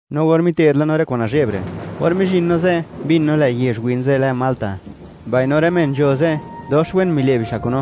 No or mite'd la no rë kwa'n nazhe'b re', or mizhin no ze', mbin no, lë' yezh win ze' lë Malta. Mbaino rë men nzho ze', dox wen mile' bixa' kun no;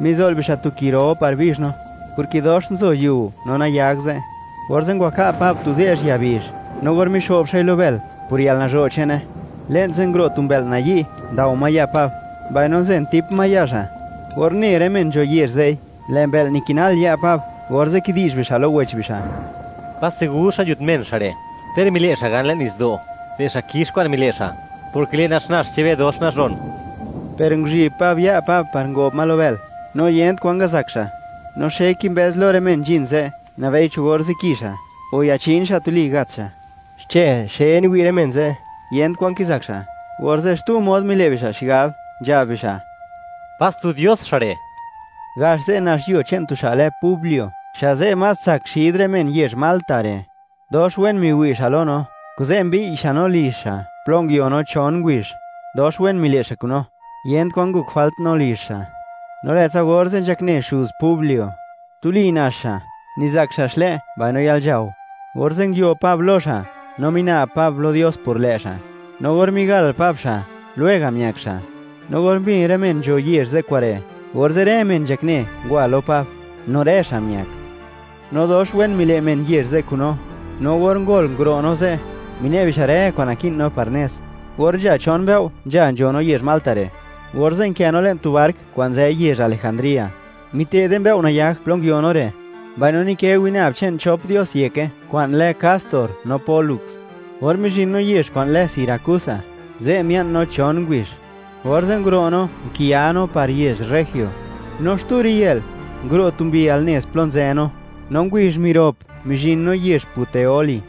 mizo'l bixa' tu ki ro par bizh no, porke dox nzo yiu no nayag ze'. Orze' ngwaka' Pab tu de'zh ya bizh, no or mixo'b xa'i lo bël, por yalnazho' che'ne, le'n ze' nguro' tu mbë'l nayi' ndao ma ya' Pab, mbaino nzentip ma ya' xa'. Or une rë men nzho yezh ze'i, lë' mbë'l nikinal ya' Pab, orze' kidi'zh bixa' lo wech bixa': ―¡Pas segur xa' nzhut men xa' re'! Ter mile' xa' gan le'n nitsdo', lë' xa' kix kwa'n mile' xa', porke lë' naxnax che'n be dox nazhon. Per nguzhi'b Pab ya' Pab par ngob ma lo bël, no yent kwan ngazak xa'. No xe kimbëz lo rë men nzhin ze', nabei cho or ziki xa', o yachin xa' tuli gat xa'. Xchë xe niwi' rë men ze', yent kwan kizak xa', orze' xtu mod mile' bixa' xigab, nzhab bixa': ―¡Pas tu dios xa' re'! Gax ze' nax yuo che'n tu xa' lë Publio, xa' ze' más tsak xid rë men yezh Malta re'. Dox wen miwi' xa' lo no, kuze' mbiy' xa' no lizh xa' plo nguio no chon ngubizh; dox wen mile' xa' kun no, yent kwan ngok jwalt no lizh xa'. No lë'tsa orze' nzhakne xuz Publio, tuli nax xa'. Nizak xa' xlë', mbaino yalnzhao. Orze' nguio Pab lo xa', no mina'b Pab lo Dios por lë' xa', no or migal Pab xa', lwega' miak xa'. No or mbin rë men nzho yezh ze' kure', orze' rë men nzhakne ngwa lo Pab; no rë xa' miak. No dox wen mile' men yezh ze' kun no, no or ngol nguro' no ze', mine' bixa' rë kwa'n naki'n no par nez. Or nzha chon mbëo' nzha nzho no yezh Malta re', orze' nkë no le'n tu bark kwa'n nzë yezh Alejandría, mite'de mbëo' nayag plo nguio no re', mbaino nikë winab che'n chop dios yeke kwa'n lë Castor no Pólux. Or mizhin no yezh kwa'n lë Siracusa, ze' mia'n no chon ngubizh. Orze' nguro' no, nkiya no par yezh Regio. No xtu riyë'l, nguro' tu mbi al nez plo nzë no, no ngubizh mirop, mizhin no yezh Puteoli.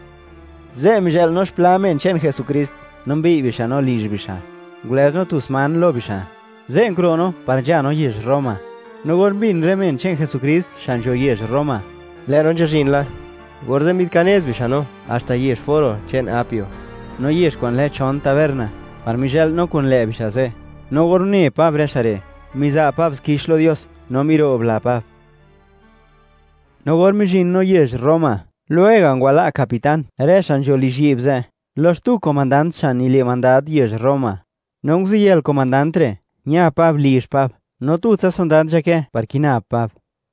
Ze' mizhë'l no xpla men che'n Jesukrist no mbiy' bixa' no lizh bixa', ngulëz no tu sman lo bixa'. Ze' nguro' no par nzha no yezh Roma. No or mbin rë men che'n Jesukrist xa' nzho yezh Roma, lë' no nzhazhin la, orze' mbi'dkinez bixa' no haxta yezh Foro che'n Apio, no yezh kwa'n lë Chon Taberna, par mizhë'l no kun lë' bixa' ze'. No or une Pab rë xa' re', miza' Pab xkix lo Dios, no miro'bla Pab. No or mizhin no yezh Roma, lwega' ngwala' capitán rë xa' nzho lizhyi'b ze' lo xtu komandant xa' nile' mandad yezh Roma. No nguziyël comandant re', ña Pab lizh Pab, no tutsa sondad nzhakë par kina Pab.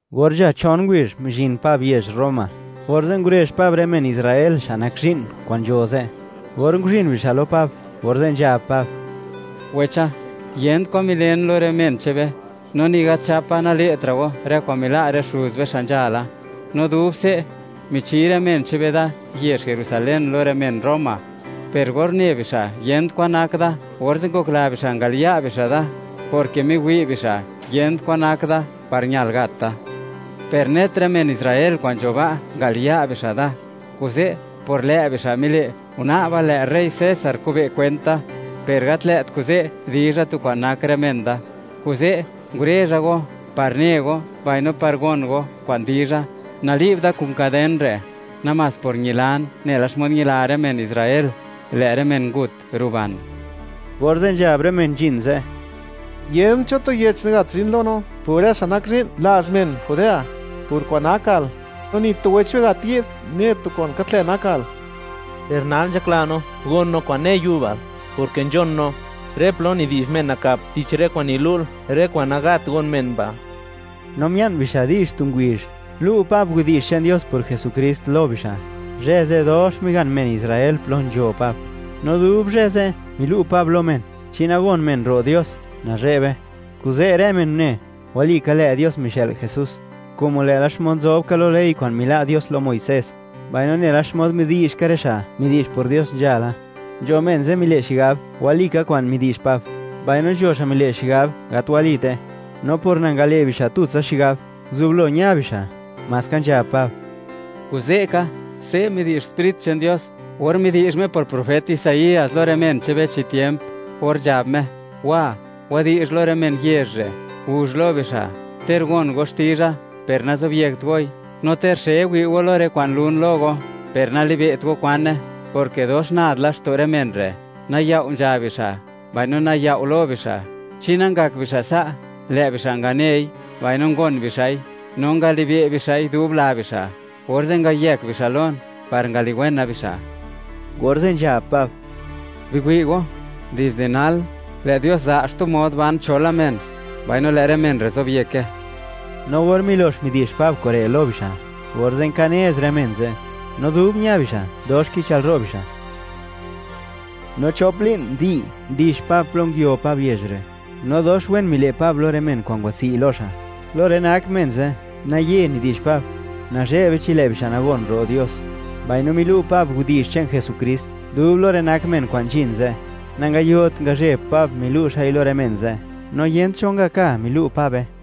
Or nzha chon ngubizh mizhin Pab yezh Roma, orze' ngurezh Pab rë men Israel xa' nak zhi'n kwa'n nzho ze'. Or nguzhin bixa' lo Pab, orze' nzhab Pab: ―Wecha, yent kwan milen lo rë men che'n be, no ni gat nzhapa nale'tra' go rë kwa'n mila' rë xuz be xa' nzhala. No dub se', michi rë men che'n be da yezh Jerusalén lo rë men Roma. Per or une bixa' yent kwan nak da, orze' ngokla bixa' ngaliya' bixa' da, porke miwi' bixa' yent kwan nak da par ñal gat da. Per net rë men Israel kwa'n nzho ba', ngaliya' bixa' da. Kuze' por lë' bixa' mile', guna'ba lë' rey César kube' kwent da, per gat lë't kuze' dizha tu kwa'n nak rë men da. Kuze' ngurezha go, par ne go, mbaino par gon go kwan dizha. Nali'b da kun kaden re', namás por ñilan nela xmod ñila rë men Israel; lë' rë men ngut ruban. Orze' nzhab rë men nzhin ze': ―Yent cho tu yech gat zhin lo no por rë xa' nak zhi'n lazh men Judea, por kwa'n nakal; no ni tu wech be gat yi'd, ne tu kwa'n gat lë' nakal. Per nal nzhakla no gon no kwa'n ne yubal; porke nzhon no, rë plo nidi'zh men nakap tich rë kwa'n nilu'l, rë kwa'n nagat gon men ba'. No mia'n bixa' di'zh tu ngubizh, lu' Pab widi'zh che'n Dios por Jesukrist lo bixa'. Zhë ze', dox migan men Israel plo nzho Pab. No dub zhë ze', milu' Pab lo men, chi nagon men ro' Dios, nazhe'be. Kuze' rë men une, walika lë' Dios mixë'l Jesús, como lë'la xmod nzob ka lo ley kwa'n mila' Dios lo Muisés, mbaino nela xmod midi'zh ka rë xa' midi'zh por Dios nzhala. Nzho men ze' mile' xigab walika kwa'n midi'zh Pab, mbaino nzho xa' mile' xigab gat walite. No por nangale' bixa' tutsa xigab, nguzublo ña bixa'; maska nzhab Pab: ―Kuze' ka, se' midi'zh Sprit che'n Dios, or midi'zh Me por profet Isaías lo rë men che'n be, chi tiemp, or nzhab Me: Wa, wadi'zh lo rë men yezh re'; guzh lo bixa': Ter gon go xtizha, per nazobyekt goi; no ter xe wi' go lo rë kwa'n lun lo go, per nalibe't go kwane, porke dox nad laxto' rë men re', nayao' nzha bixa', mbaino nayao' lo bixa'. Chi nangak bixa' sa', lë' bixa' nganei mbaino ngon bixa'i, no ngalibe' bixa'i dub la bixa', orze' ngayëk bixa' lon par ngaliwena bixa'. Orze' nzhab Pab: ―Biwi' go, dizde nal, lë' Dios za' xtu mod ban cho la men, mbaino lë' rë men re' zobyeke. No or milox midi'zh Pab kure' lo bixa', orze' nkanez rë men ze'; no dub ña bixa', dox kichëlro' bixa'. No chop li'n komplet, ndix Pab plo nguio Pab yezh re', no dox wen mile' Pab lo rë men kwa'n ngwatswi' lo xa'. Lo rë nak men ze', naye nidi'zh Pab, nazhe'be chi lë' bixa' nagon ro' Dios, mbaino milu' Pab widi'zh che'n Señor Jesukrist dub lo rë nak men kwa'n nzhin ze', nangayot ngazhe'b Pab milu' xa'i lo rë men ze', no yent cho ngaka milu' Pabe.